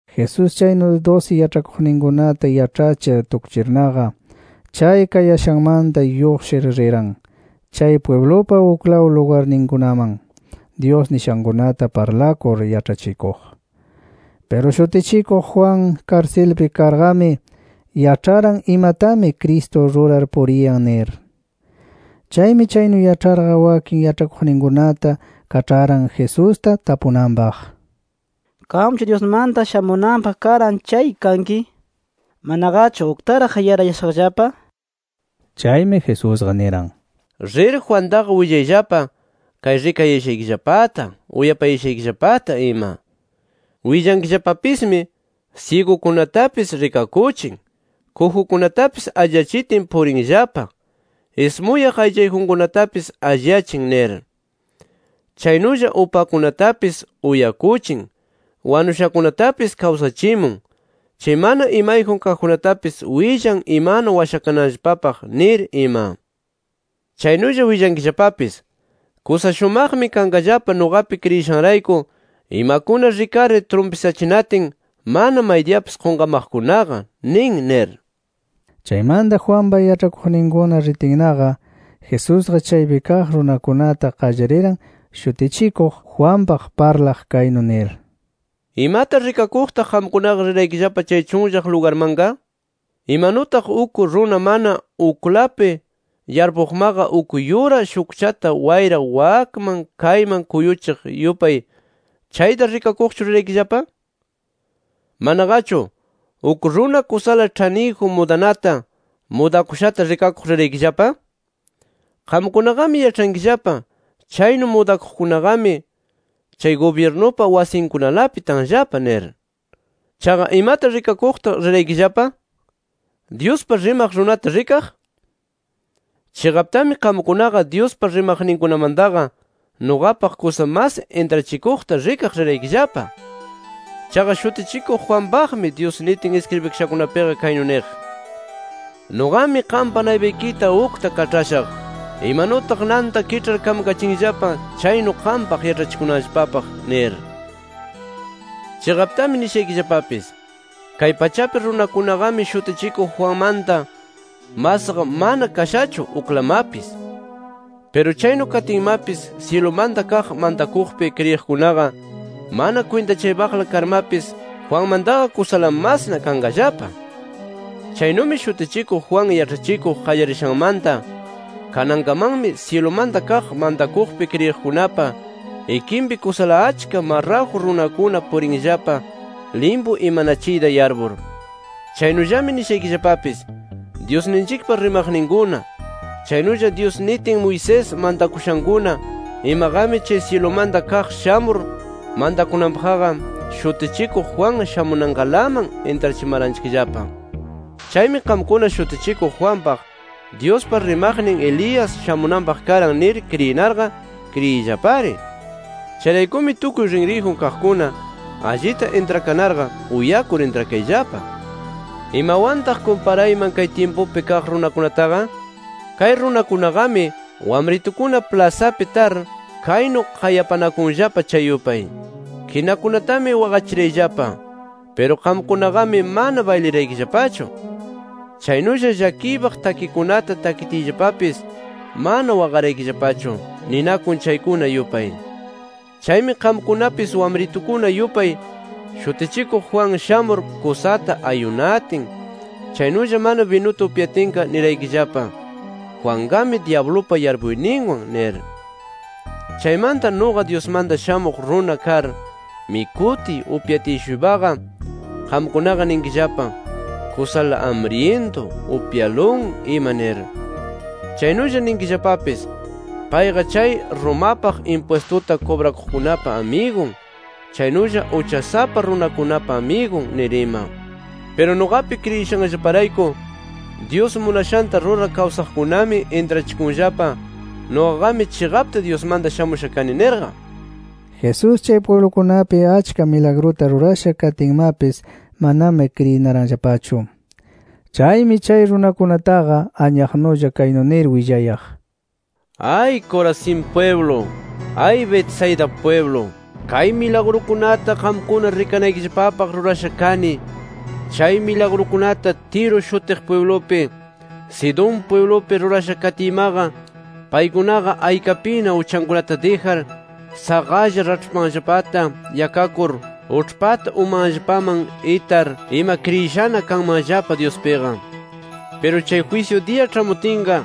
Jesús chaynu dusi yaĉhakuqninkunata yaĉhachir tukchirnaqa, chay kayashanmanta lluqshir riran, chay pwiblupa uklaw lugarninkunaman Dyus nishankunata parlakur yaĉhachikuq. Piru Shutichikuq Juan, karsilpi karqami, yaĉharan imatami Cristo rurar puriyan nir. Chaymi chaynu yaĉharqa, wakin yaĉhakuqninkunata kaĉharan Jesusta tapunanpaq: —¿Qamchu Dyusmanta shamunanpaq karan chay kanki, manaqachu uktaraq yarayashaqllapa? nir. Chaymi Jesusqa niran: —Rir Juantaqa willayllapa, kay rikayashaykillapata, uyapayashaykillapata ima. Willankillapapismi: ‘Syigukunatapis rikakuchin, kujukunatapis alliyachitin purinllapa, ismuyaq aychayjunkunatapis alliyachin nir. Chaynulla upakunatapis uyakuchin, wanushakunatapis kawsachimun, chay mana imayjun kaqkunatapis willan imanu washakananllapapaq’ nir ima. Chaynulla willankillapapis: ‘¡Kusa shumaqmi kanqallapa nuqapi kriyishanrayku imakuna rikarir trumpisachinatin mana maydiyapis qunqamaqkunaqa nin!’ nir. Chaymanta Juanpa yaĉhakuqninkuna ritinnaqa, Jesusqa chaypi kaq runakunata qallariran Shutichikuq Juanpaq parlaq, kaynu nir: “¿Imata rikakuqtaq qamkunaqa riraykillapa chay chunllaq lugarmanqa? Imanutaq uk runa mana uklapi yarpuqmaqa uk yura shukchata wayra wakman kayman kuyuchiq yupay ¿chayta rikakuqchu riraykillapa? ¿Manaqachu, uk runa kusala ĉhaniyjun mudanata, mudakushata rikakuq riraykillapa? Qamkunaqami yaĉhankillapa chaynu mudakuqkunaqami, chay gubyirnupa wasinkunalapi tanllapa nir. Chaqa, ¿imata rikakuqtaq riraykillapa? ¿Dyuspa rimaq runata rikaq? Chiqaptami qamkunaqa Dyuspa rimaqninkunamantaqa nuqapaq kusa mas intrachikuqta rikaq riraykillapa. Chaqa Shutichikuq Juanpaqmi, Dyus nitin iskribikashakunapiqa kaynu niq: ‘Nuqami qampa naypaykita ukta kaĉhashaq, imanutaq nanta kiĉhar kamkachinllapa chaynu qampaq yaĉhachikunanpaq’ nir. Chiqaptami nishaykillapapis: Kay pachapi runakunaqami Shutichikuq Juanmanta masqa mana kashachu uklamapis. Piru chaynu katinmapis syilumanta kaq mantakuqpi kriyiqkunaqa mana kwintachaypaqla karmapis Juanmantaqa kusala masna kanqallapa. “Chaynumi Shutichikuq Juan yaĉhachikuq qallarishanmanta kanankamanmi syilumanta kaq mantakuqpi kriyiqkunapa ikinpi kusala achka marraju runakuna purinllapa limpu imanachiyta yarpur. Chaynullami nishaykillapapis: Dyusninchikpa rimaqninkuna chaynulla Dyus nitin Moisés mantakushankuna imaqami syilumanta kaq shamur mantakunanpaqqa Shutichikuq Juan shamunankalaman intrachimaranchikllapa. Chaymi qamkuna Shutichikuq Juanpaq, Dyuspa rimaqnin Elías shamunanpaq karan nir kriyinarqa kriyiyllapari. Chayraykumi tukuy rinriyjun kaqkuna, allita intrakanarqa uyakur intrakayllapa. “¿Imawantaq kumparayman kay tyimpupi kaq runakunataqa? Kay runakunaqami, wamritukuna plasapi tar kaynu qayapanakunllapa chay yupay: ‘Kinakunatami waqachirayllapa. Piru qamkunaqami mana bayliraykillapachu. Chaynulla llakiypaq takikunata takitiyllapapis, mana waqaraykillapachu’ ninakun chaykuna yupay. Chaymi qamkunapis wamritukuna yupay, Shutichikuq Juan shamur kusata ayunatin, chaynulla mana binuta upyatinqa niraykillapa: ‘Juanqami dyablupa yarpuyninwan’ nir. Chaymanta nuqa Dyusmanta Shamuq Runa kar, mikutiy upyatiy-shuypaqa qamkunaqa ninkillapa: ‘Kusala amryintu, upyalun’ ima nir. Chaynulla ninkillapapis: ‘Payqa chay Romapaq impwistuta kubrakuqkunapa amigun chaynulla uchasapa runakunapa amigun’ nir ima. Piru nuqapi kriyishanllaparayku Dyus munashanta rurar kawsaqkunami intrachikunllapa nuqaqami chiqapta Dyusmanta shamusha kani nirqa”. Jesús chay pwiblukunapi achka milagruta rurasha katinmapis manami kriyinaranllapachu. Chaymi chay runakunataqa anyaqnulla kaynu nir willayaq: “¡Ay Corazín pwiblu! ¡Ay Betsaida pwiblu! Kay milagrukunata qamkuna rikanaykillapapaq rurasha kani, chay milagrukunata Tiro shutiq pwiblupi, Sidón pwiblupi rurasha katiymaqa, paykunaqa aykapina uchankunata dijar, saqalla raĉhpanllapata yakakur, uĉhpata umanllapaman itar ima kriyishana kanmanllapa Dyuspiqa. “Piru chay jwisyu diya ĉhamutinqa,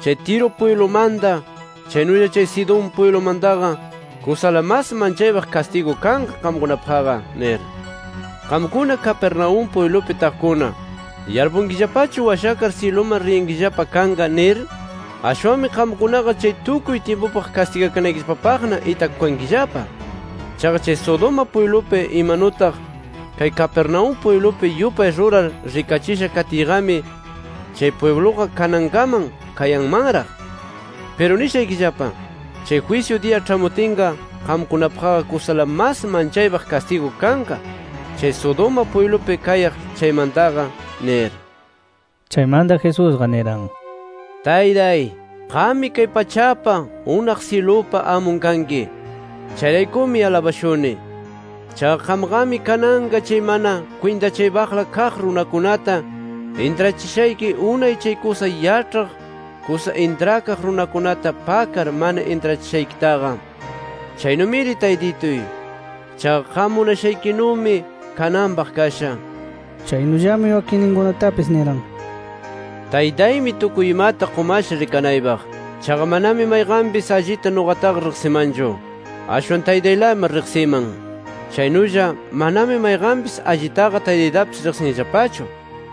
chay Tiro pwiblumanta, chaynulla chay Sidón pwiblumantaqa kusala mas manchaypaq kastigu kanqa qamkunapaqqa nir. Qamkuna Capernaúm pwiblupi taqkuna, ¿yarpunkillapachu washakar syiluman riyankillapa kanqa nir? Ashwanmi qamkunaqa chay tukuy tyimpupaq kastigakanaykillapapaqna itakukankillapa. Chaqa chay Sodoma pwiblupi imanutaq kay Capernaúm pwiblupi yupay rurar rikachisha katiyqami, chay pwibluqa kanankaman kayanmanraq. Piru nishaykillapa: Chay jwisyu diya ĉhamutinqa, qamkunapaqqa kusala mas manchaypaq kastigu kanqa chay Sodoma pwiblupi kayaq chaymantaqa nir”. Chaymanta Jesusqa niran: “¡Taytay! Qammi kay pachapa, unaq syilupa amun kanki. Chayraykumi alabashuni. Chaqa qamqami kananqa chay mana kwintachaypaqla kaq runakunata intrachishayki unay chay kusa yaĉhaq, kusa intrakaq runakunata pakar mana intrachishaykitaqa. Chaynumiri Taytituy. Chaqa qam munashaykinumi kananpaq kasha”. Chaynullami wakinninkunatapis niran: “Taytaymi tukuy imata qumasha rikanaypaq. Chaqa manami mayqanpis allita nuqataqa riqsimanchu. Ashwan Taytaylami riqsiman. Chaynulla, manami mayqanpis allitaqa Taytaytapis riqsinllapachu.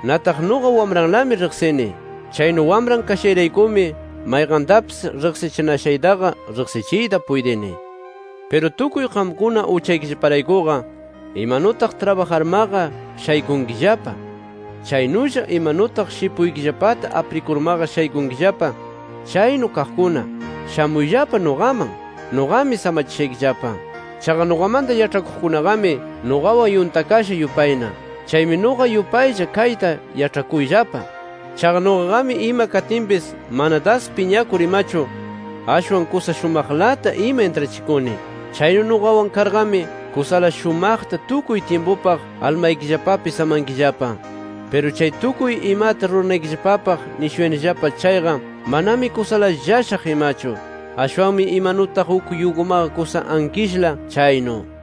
Nataq nuqa Wamranlami riqsini. Chaynu Wamran kashayraykumi mayqantapis riqsichinashaytaqa riqsichiyta puytini. Piru tukuy qamkuna uchaykillaparaykuqa imanutaq trabajarmaqa shaykunkillapa, chaynulla imanutaq shipuykillapata aprikurmaqa shaykunkillapa chaynu kaqkuna, shamuyllapa nuqaman. Nuqami samachishaykillapa. Chaqa nuqamanta yaĉhakuqkunaqami nuqawan yuntakasha yupayna. Chaymi nuqa yupaylla kayta yaĉhakuyllapa. Chaqa nuqaqami ima katinpis mana das piñakur imachu, ashwan kusa shumaqlata ima intrachikuni. Chaynu nuqawan karqami kusala shumaqta tukuy tyimpupaq almaykillapapi samankillapa. Piru chay tukuy imata ruranaykillapapaq nishuyanillapa chayqa manami kusala llashaq imachu. Ashwanmi imanutaq uk yugumaqa kusa ankishla chaynu”.